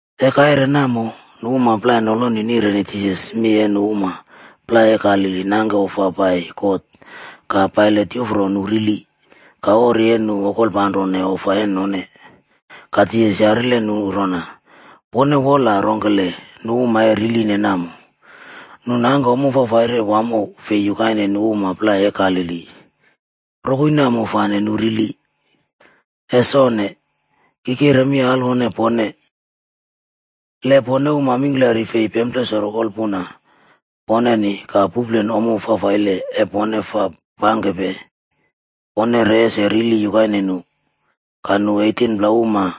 E kaire namo nu uma plai noloni nireni Jisas mi e nu uma plai e Galili nangke ofa pai God ka Pailat yufro nu rili ka ori e nu okolpanrone ofa e none. Ka Jisas yarile nu rona, “Pone wola rongkele nu uma e riline namo, nu nangke ommo fafaire wamo fi yukaine nu uma plai e Galili, rokoi namo fane nu rili? Es onne! Ki kire mi alwone pone. Le pone uma mingklari fei pemplesoro wolpuna poneni ka puplen ommo fafaile e pone fa pangkepe, pone re ese rili yukaine nu. Ka nu 18pla uma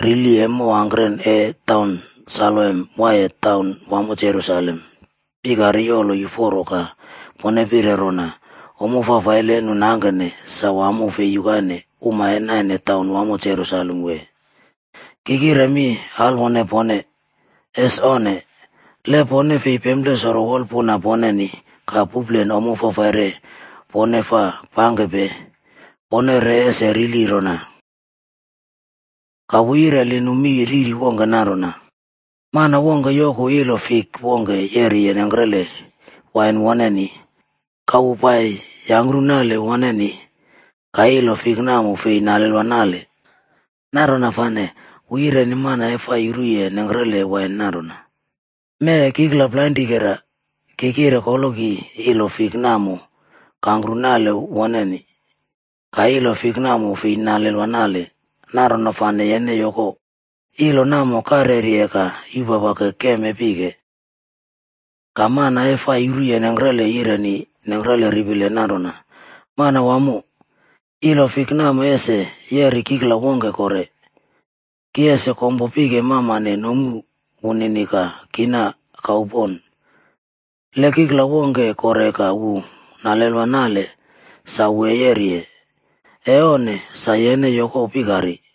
rili e mow angkren e taun Saloam waiye taun wamo Jerusalem pikari yolo yuforo ka pone pire rona ommo fafaile e nu nangkene sa wamo fi yukaine uma e naine taun wamo Jerusalem wee? Ki kire mi alwone pone, es onne. Le pone fei pemplesoro wolpuna poneni ka puplen ommo fafaire pone fa pangkepe, pone re ese rili rona.” Ka wu yireli nu mi riri wongke nanrona, “Mana wongke yoku ilo fik wongke yeriye nengkrele wain woneni, ka wu pai yire yangkru nale woneni, ka ilo fik namo fei nalelwa nale. Nanrona fane wu yireni mana e fa yuruye nengkrele wain nanrona, ‘Mee kikla plainrikera, ki kire koloki ilo fik namo kangkru nale woneni, ka ilo fik namo fei nalelwa nale. Nanrona fane yene yoko, ilo namo karyeri ka yupapake keem e pike.’ “Ka mana e fa yuruye nengkrele yireni nengkrele ripile nanrona, ‘Manawamo, ilo fik namo ese yeri kikla wongke kore. Ki ese kompo pike mamane nomu woneni ka kina kau pon. Le kikla wongke kore ka wu nalelwa nale sa wu e yeriye, e onne sa yene yoko pikari.’”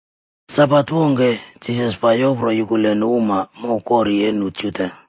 Sabat wongke, Jisas pai yopro yukule nu uma mow kori e nu Juda.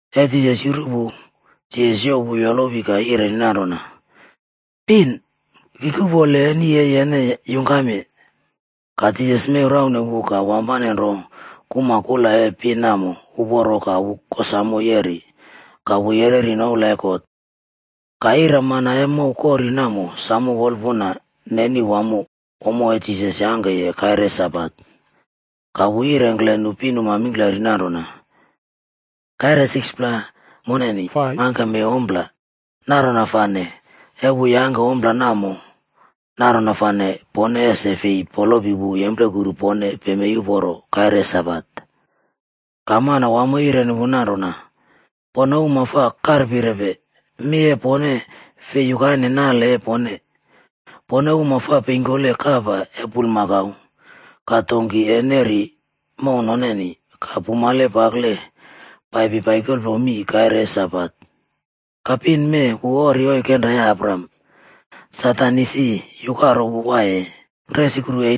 E Jisas yuru wu, Jisas youw wu yolowi ka yireni nanrona, “Pin, Ki kuꞌpole eni e yene yungkamye.” Ka Jisas mew raune wu ka wampane nro kuma kula e pin namo uporo ka wu kosamo yeri ka wu yereri noula e God. Ka ira mana e mow kori namo samo wolpuna neni wamo ommo e Jisas yangkeye kaire e Sabat. Ka wu yirengkle nu pinuma mingklari nanrona, “Kaire 6pla moneni fai mangkeme ompla, nanrona fane, e wu yangke ompla namo, nanrona fane pone ese fi polopi wu yemplekuru pone pemei uporo kaire e Sabat.” Ka Manawamo yireni wu nanrona, “Pone uma fa karpirepe! Mi e pone fei yukaine nale e pone. Pone uma fa peingkole kapa e bulmakau ka donki e neri mow noneni ka pumale pakle paipi naikole mii kaire e Sabat. Ka pin mee wu ori oikenra e Abraham, Satan isi yukaro wu waiye resukru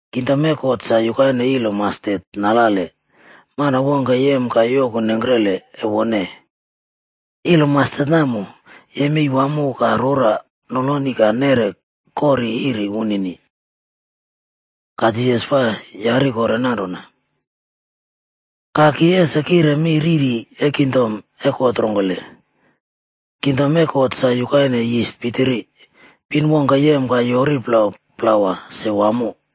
Kingdom e God sa yukaine ilo mastet nalale, mana wongke yem ka yoku nengkrele e wone. Ilo mastet namo yemei wamo ka rora noloni ka neꞌre kori iri wunini.” Ka Jisas fa yari kore nanrona, “Ka ki ese kire mi riri e kingdom e God rongkele? Kingdom e God sa yukaine yis pitiri, pin wongke yem ka yoꞌri plau plawa se wamo.”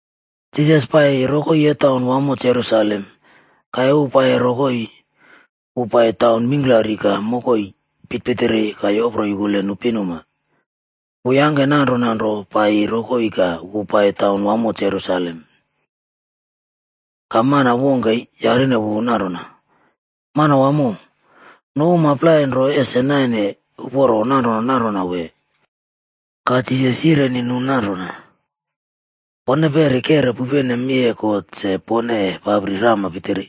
Jisas paiye rokoi e taun wamo Jerusalem. Ka e wu paiye rokoi, wu pai taun mingklari ka mokoi pitirpitiri ka yopro yukule nu pinuma. Wu yangke nanrona nro paiyiye rokoi ka wu pai taun wamo Jerusalem. Ka mana wongke yarine wu nanrona, “Manawamo, nu uma plai nro ese naine uporo nanrona nanrona wee?” Ka Jisas yireni nu nanrona, “Pone peri kero pupene mi e God se pone e papri rama pitiri.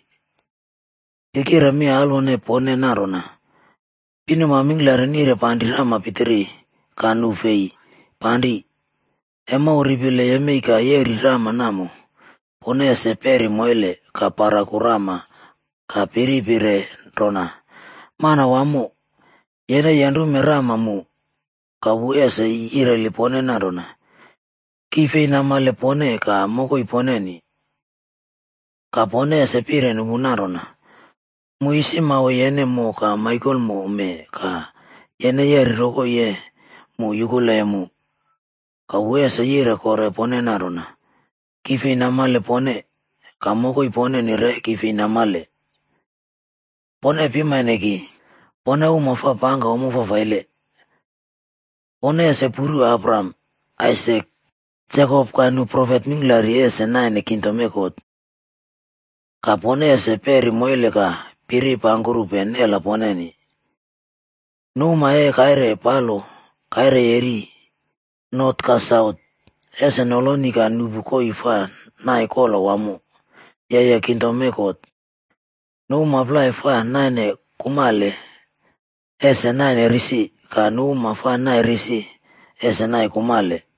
Ki kire mi alwone pone nanrona, pinuma mingklari nire panri rama pitiri, ka nu fei panri. E mow ripile yemei ka reꞌri rama namo, pone ese peri moile ka paraku rama ka piri pire rona, ‘Manawamo, yene yenrume rama mu.’ “Ka wu ese yireli pone nanrona, ‘Ki fei namale pone ka mokoi poneni.’ “Ka pone ese pireni wu nanrona, ‘Mu isi mawe yene mo ka maikomo mee ka yene yeri rokoi e mu yukuleye mu.’ “Ka wu ese yire kore pone nanrona, ‘Ki fei namale pone, ka mokoi poneni re ki fei namale. Pone pimane ki, pone uma fa pangke ommo fafaile.’ “Pone ese puru Abraham, Aisak, Jekop ka nu profet mingklari ese naine kingdom e God. Ka pone ese peri moile ka piri pangkurupe nela poneni. Nu uma e kaire palo, kaire yeri, not ka saut ese noloni ka nuꞌpu koii fa nai kola wamo, yeye kingdom e God. Nu uma plai fa naine kumale ese naine risi ka nu uma fa naine risi ese naine kumale.”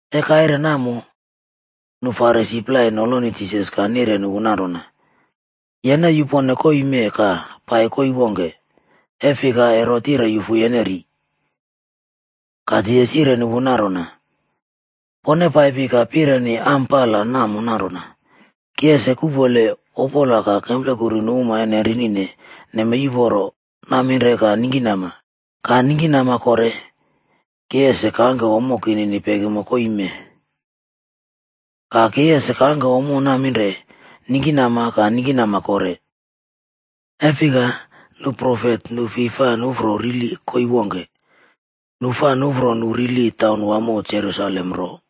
E kaire namo, nu Farisi plai noloni Jisas ka nireni wu nanrona, “Yene e yupone koii mee ka pai koii wongke, e fika Herot yire yufu yene ri.” Ka Jisas yirengkle nu nanrona, “Pone paipi ka pireni am pala namo nanrona, ‘Ki ese kuꞌpole opola ka kemplekuru nu uma e nenrinine nemei uporo naminre ka ningkinama, ka ningkinama kore ki ese kangke ommo kinini pekimo koii mee.’ Ka ki ese kangke ommo naminre, ningkinama ka ningkinama kore, e fika nu profet nu fi fa nuꞌfro rili koii wongke, nu fa nuꞌfro nu rili taun wamo Jerusalem nro.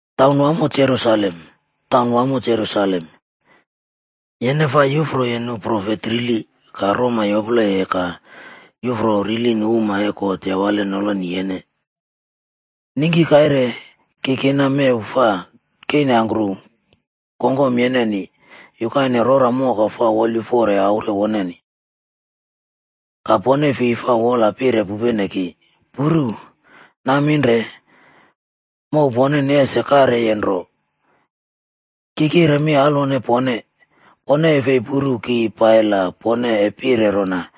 “Taun wamo Jerusalem! Taun wamo Jerusalem! Yene fa yufroye nu profet rili ka roma yopleye ka yufro rili nu uma e God yawale noloni yene. Ningki kaire ki kina mew fa keinangkru kongkom yeneni yukaine rora moka fa wolyuforoye aure woneni. Ka pone fi fa wola pire pupene ki! Puru! Naminre mow poneni ese karyeye nro. Ki kire mi alwone pone, pone e fi puru ki pai la pone e pire rona,